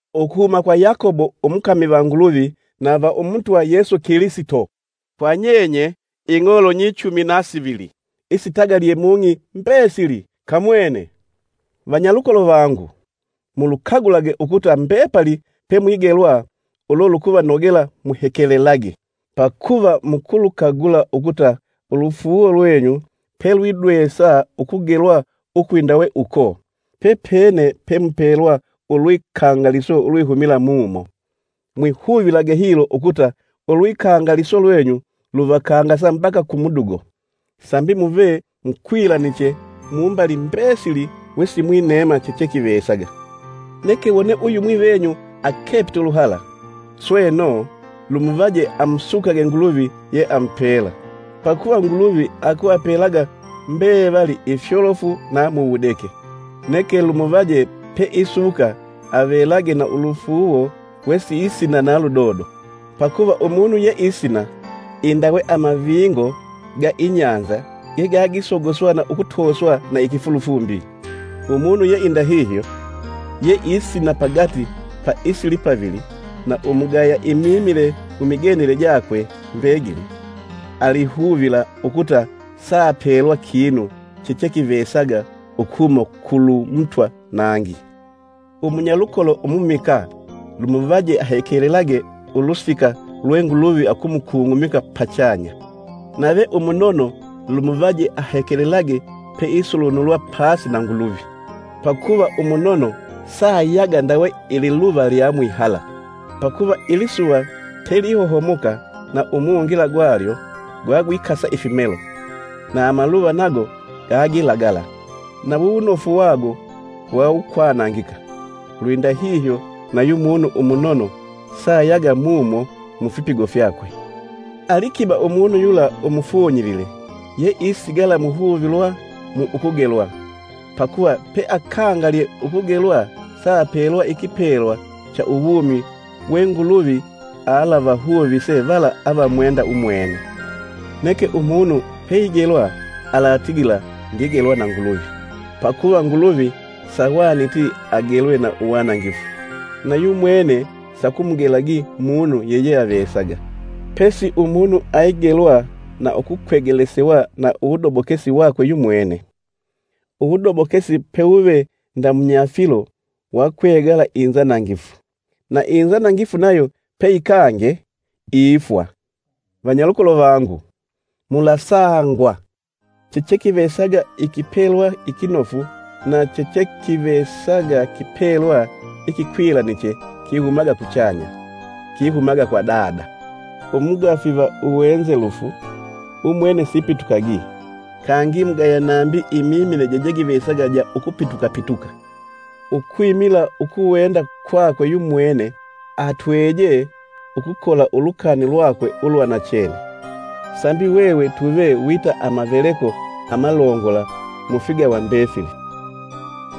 Ukuhuma kwa Yakobo umukami va Nguluvi na va Umutwa Yesu Kilisito, kwa nyenye, ing'olo nyichumi na sivili, isitagalye mung'i mbesili! Kamwene! Vanyalukolo vangu, mulukagulage ukuta mbepali pemwigelwa ulo lukuvanogela muhekelelage, pakuva mukulukagula ukuta ulufuuwo lwenyu pelwidwesa ukugelwa ukwindawe uko, pepene pemupelwa ulwikangaliso ulwihumila mumo. Mwihuvilage hilo ukuta ulwikangaliso lwenyu luvakangasa mbaka ku mudugo, sambi muve mukwilaniche mumbali mbesili wesimwineema chechekivesaga. Neke wone uyumwi venyu akepite uluhala, sweno, lumuvaje amusukage Nguluvi ye amupela; pakuva Nguluvi akuvapelaga mbevali ifyolofu na mu wudeke. Neke lumuvaje peisuka avelage na ulufuuwo wesiisina na ludodo. Pakuva umunu yeisina indawe amavingo ga inyanza gegagisogoswa na ukutoswa na ikifulufumbi. Umunu yeindahihyo, yeisina pagati pa isilipavili na umugaya imimile mumigendele jakwe mbegili, alihuvila ukuta saapelwa kinu chechekivesaga ukuhuma kulu Mutwa nangi. Umunyalukolo umumikaa lumuvaje ahekelelage ulusika lwe Nguluvi akumukung'umika pachanya; nave umunono lumuvaje ahekelelage peisulunulwa pasi na Nguluvi. Pakuva umunono saayaga ndawe ililuva lya mwihala. Pakuva ilisuva pelihohomoka na umungila gwalyo gwagwikasa ifimelo, na maluva nago gagilagala, na wuwunofu wago wawukwanangika. Lwindahihyo, nayu munu umunono saayaga mumo mufipigo fyakwe. Alikiba umunu yula umufunyilile yeisigala muhuvilwa mu ukugelwa, pakuva peakangalye ukugelwa saapelwa ikipelwa cha uwumi we Nguluvi alavahuvise vala avamwenda umwene. Neke umunu peigelwa alatigila, “Ndigelwa na Nguluvi.” Pakuva Nguluvi sahwaniti agelwe na uwanangifu na yumwene sakumugelagi munu yeyeavesaga. Pesi umunu aigelwa na ukukwegelesewa na uwudobokesi wakwe yumwene. Uwudobokesi pewuve ndamunyafilo wakwegala inzanangifu, na inzanangifu nayo peyikange ifwa. Vanyalukolo vangu, mulasangwa! Chechekivesaga ikipelwa ikinofu na chechekivesaga kipelwa ikikwilaniche kihumaga kuchanya; kihumaga kwa Dada, umugafi va uwenzelufu, umwene sipitukagi, kangi mugaya nambi imimile jejegivesaga ja ukupitukapituka. Ukwimila ukuwenda kwakwe yumwene atwejee ukukola ulukani lwakwe ulwa nachene, sambi hwehwe tuve wita amalongola mufigawa mbefili.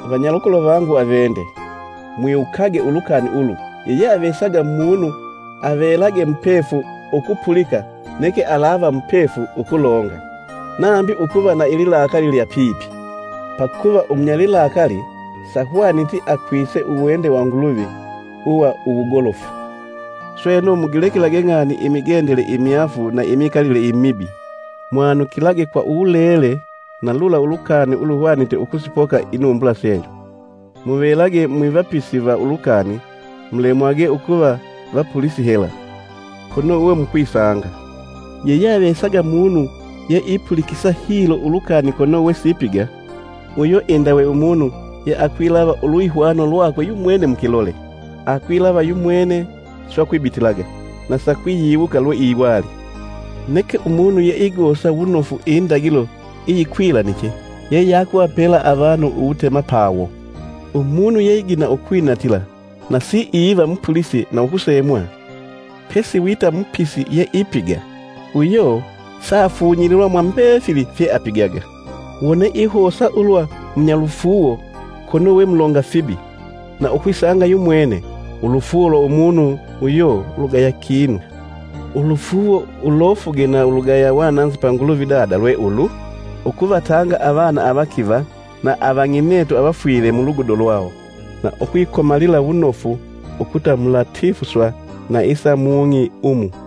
Vanyalukolo vangu avende, mwiwukage ulukani ulu yeyeavesaga munu avelage mupefu ukupulika neke alawa mupefu ukulonga, nambi ukuva na ililakali lya pipi. Pakuva umunyalilakali sahwaniti akwise uwende wa Nguluvi uwa uwugolofu. Sweno mugilekelage ng'ani imigendele imyaafu na imikalile imibi; mwanukilage kwa uwulele na lula uluhwanite ukusipoka inumbula senyu. Muvelage mwivapisi va ulukani, mulemwage ukuva vapulisi hela, kono we mukwisanga. Yeyeavesaga munu yeipulikisa hilo ulukani kono wesipiga, uyo indawe umunu yeakwilava ulwihwano lwakwe yumwene mukilole. Akwilava yumwene, swe akwibitilaga, na sakwiyiwuka lweiwali. Neke umunu yeigosa wunofu indagilo iyikwilaniche yeyakuvapela avanu uwutemapawo, umunu yeigina ukwinatila nasi iva mupulisi na ukusemwa, pesi wita mupisi yeipiga uyo saafunyililwa mwa mbefili fyeapigaga. Wone ihosa ulwa munyalufuuwo, kono we mulonga fibi na ukwisanga yumwene, ulufuuwo lwa umunu uyo lugaya kinu. Ulufuuwo ulofuge na ulugaya wananzi pa Nguluvi Dada lwe ulu: Ukuvatanga avana avakiva na avang'inetu avafwile mulugudo lwawo, na ukwikomalila wunofu ukuta mulatifuswa na isa mung'i umu.